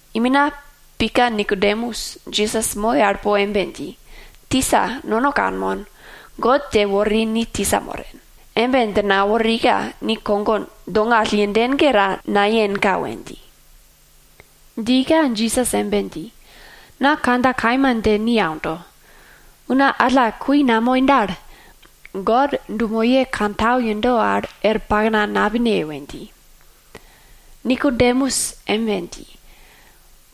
Imina pika Nikodemus Jisas moi al po embe dji, tisa, nono kanmon, God dje wori ni tisa moren. Embe dje naworika ni kogo dongall yenden ge ta nayenka we dji. Djika Jisas embe dji, na kandja kaima dje ni aundo, una alla gun namoi dal, God dumoye wopake kantau yendo al er pakna napine we dji. Nikodemus embe dji,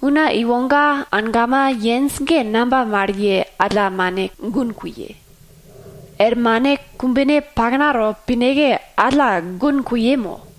una iwoga angama yenj ge namba mal ye alla mane gun kuye? Er mane kumbene al paknato pineke, alla gun kuye mo?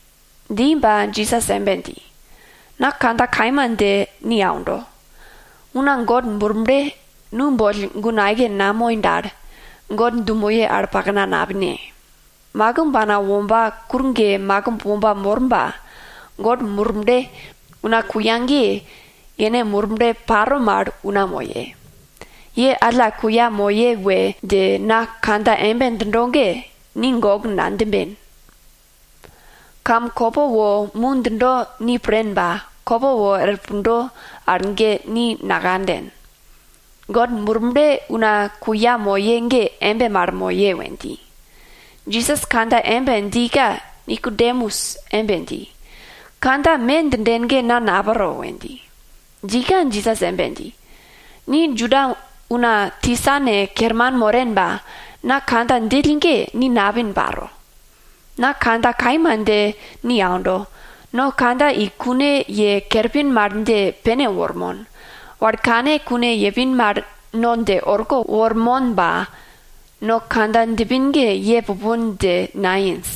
Dji ba Jisas embe dji, na kandja kaima dje ni aundo, una God Murble nu boll gun aike namoi dal, God dumoye wopake yero al er pakna napine. Makimb ana womba kur ge makimb womba mor ba, God Murble una kuya ge, yene Murble paro mal una moye. Ye alla kuya moye we dje na kandja embe djindo ge, ni gok nadjimben. Kam kopo wo mu djindo ni pren ba, kopo wor pundo al ge ni nakanden. God Murble una kuya moye ge embe mal moye we dji. Jisas kandja embe djika Nikodemus embe dji, kandja me djinden ge na napro we dji. Djika Jisas embe dji, ni Juda una tisane kerman moren ba, na kandja djill ge ni napin paro. Na kandja kaima dje ni aundo, no kandja i kune ye kerpin mal dje pene wormon, wal kane kune yepin mal no dje orko wormon ba, no kandja djipin ge ye pupon dje nayenj.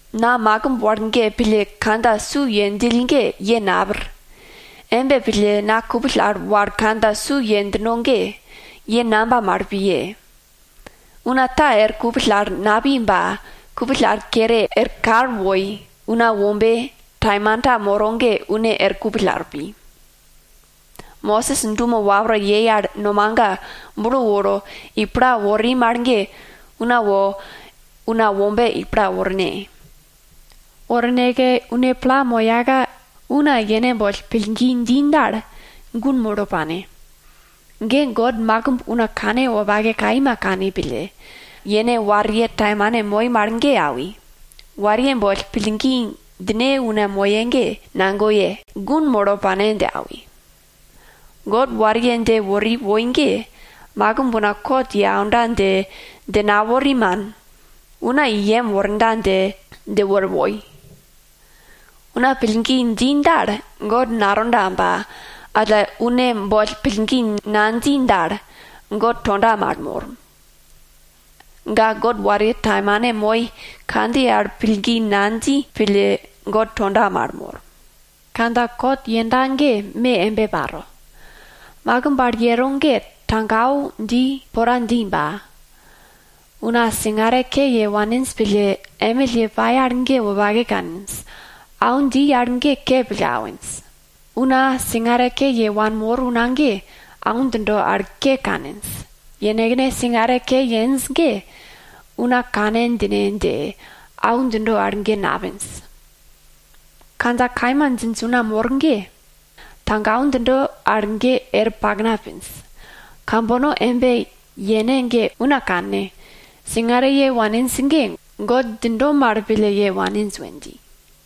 Na makimb wal ge pille kandja su ye djill ge ye napir. Embe pille na kupill al wal kandja su ye djino ge, ye namba mal piye? Una ta er kupill al napi ba, kupill al kere er kal woi Una Wombe taimanta moro ge, une er kupill al pi. Mosis dumo wapra yei al nomaga bulo woro i pla wori mal ge, una wo Una Wombe i pla worne. Worneke une pla moyaka una yene boll pillgi dji dal, gun molo pane. Ge God makimb una kanwopake kaima kani pille, yene wariye taimane moi mal ge awi, wariye boll pillgi djine una moye ge, nagoye, gun molo pane dje awi. God wariye dje wori woi ge, makimb una kot ye aunda dje, dje nawori, man. Una i yem worda dje, dje wori woi. Una pillgi dji dal, God natonda ba, alla une boll pillgi nadji dal, God tonda mal mor. Ga God wariye taimane moi kandjiye al pillgi nadji pille God tonda mal mor. Kandja kot yenda ge me embe paro, makimb al yero ge tago au dji pora dji ba, una singare ke ye waninj pille, emill ye pai al ge wopake kaninj, au dji al ke pille awinj. Una singare ke ye wanmor una ge au djindo al ke kaninj, yenekne singare ke yenj ge, una kane djine dje au djindo al ge napinj. Kandja kaima djinj una mor ge, tago au djindo al ge er pakna pinj. Kambono embe yene ge una kanne, singare ye waninj ge God djindo mal pille ye waninj we dji.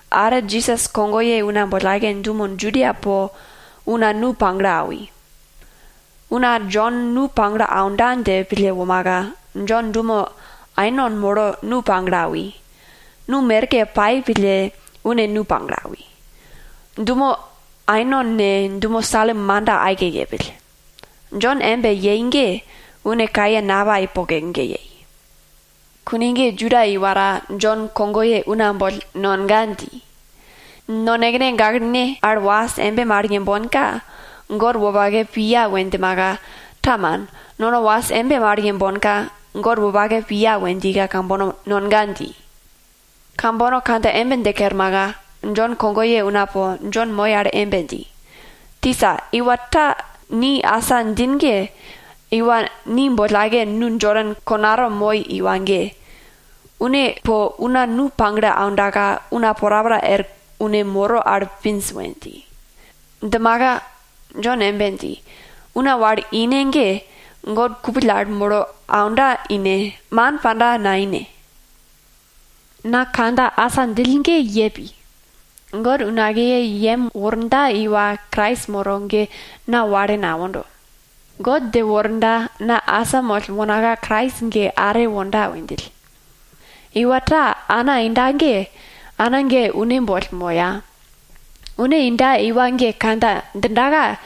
Are Jisas kogoye una boll aike dumo Judia po una nu pagle awi. Una Jon nu pagle aunda dje pille womaka, Jon dumo Ainon molo nu pagle awi, nu merke pai pille une nu pagle awi. Dumo Ainon ne, dumo Salim manda aike yepill. Jon embe yei ge, une kaye napai poke ge yei. Kune ge Juda iwa ta Jon kogoye una boll nonga dji. Nonekene gaklene al was embe mal yembonka, God wopake piya we djimaka, ta, man, nono was embe mal yembonka, God wopake piya we djika kambono nonga dji. Kambono kandja embe dje kermaka, Jon kogoye una po Jon moi al embe dji, tisa, iwa ta ni asa djin ge, iwa ni boll aike nu Jodan konato moi iwa ge, une po una nu pagle aundaka una porapora er une moro al pinj we dji. Djimaka Jon embe dji, una wal ine ge, God kupill al molo aunda ine, man panda naine. Na kandja asa djill ge ye pi, God unakiye i yem worda iwa Krais moro ge na wale nawondo. God dje worda na asamoll wonaka Krais ge are wonda we djill. Iwa ta ana inda ge, ana ge une boll moya. Une inda iwa ge kandja djindaka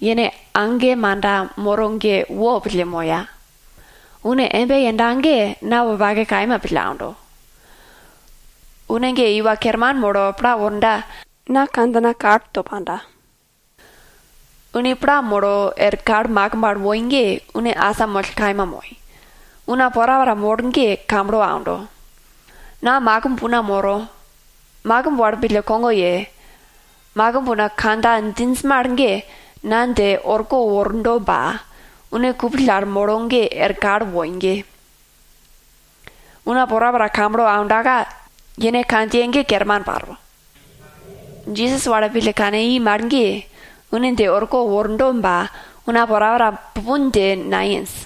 yene age manda moro ge wopille moya. Une embe yenda ge na wopake kaima pille aundo. Une ge iwa kerman molo pla worda, na kandjina kalto panda. Une pla molo er kal makimb al woi ge, une asamoll kaima moi, una porapora mor ge kamblo aundo. Na makimb una moro, makimb wal pille kogo ye, makimb una kandja djinj mal na dje orko wordo ba, une kupill al molo er kal woi ge, una porapora kamblo aundaka, yene kandjiye ge kerman paro. Jisas wal pille kane i mal ge, une dje orko wordo ba, una porapora pupon dje nayenj.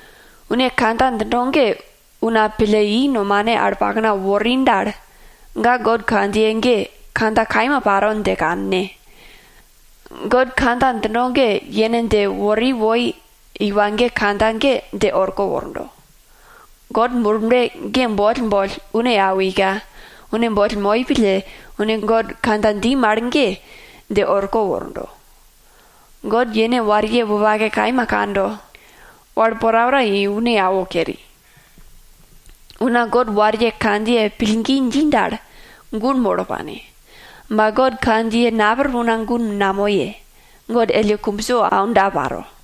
Une kandja djindo ge una pille i nomane al pakna wori dal, ga God kandjiye ge, kandja kaima paro dje kanne. God kandja djindo ge, yene dje wori woi iwa ge kandja ge dje orko wordo. God Murble ge boll boll une awika, une boll moi pille, une God kandja dji mal ge dje orko wordo. God yene wariye wopake kaima kando, wal porapora i une awo keri. Una God wariye kandjiye pillgi dji dal, gun molo pane. Ba God kandjiye napir una gun namoye, God elle kumbso aunda paro.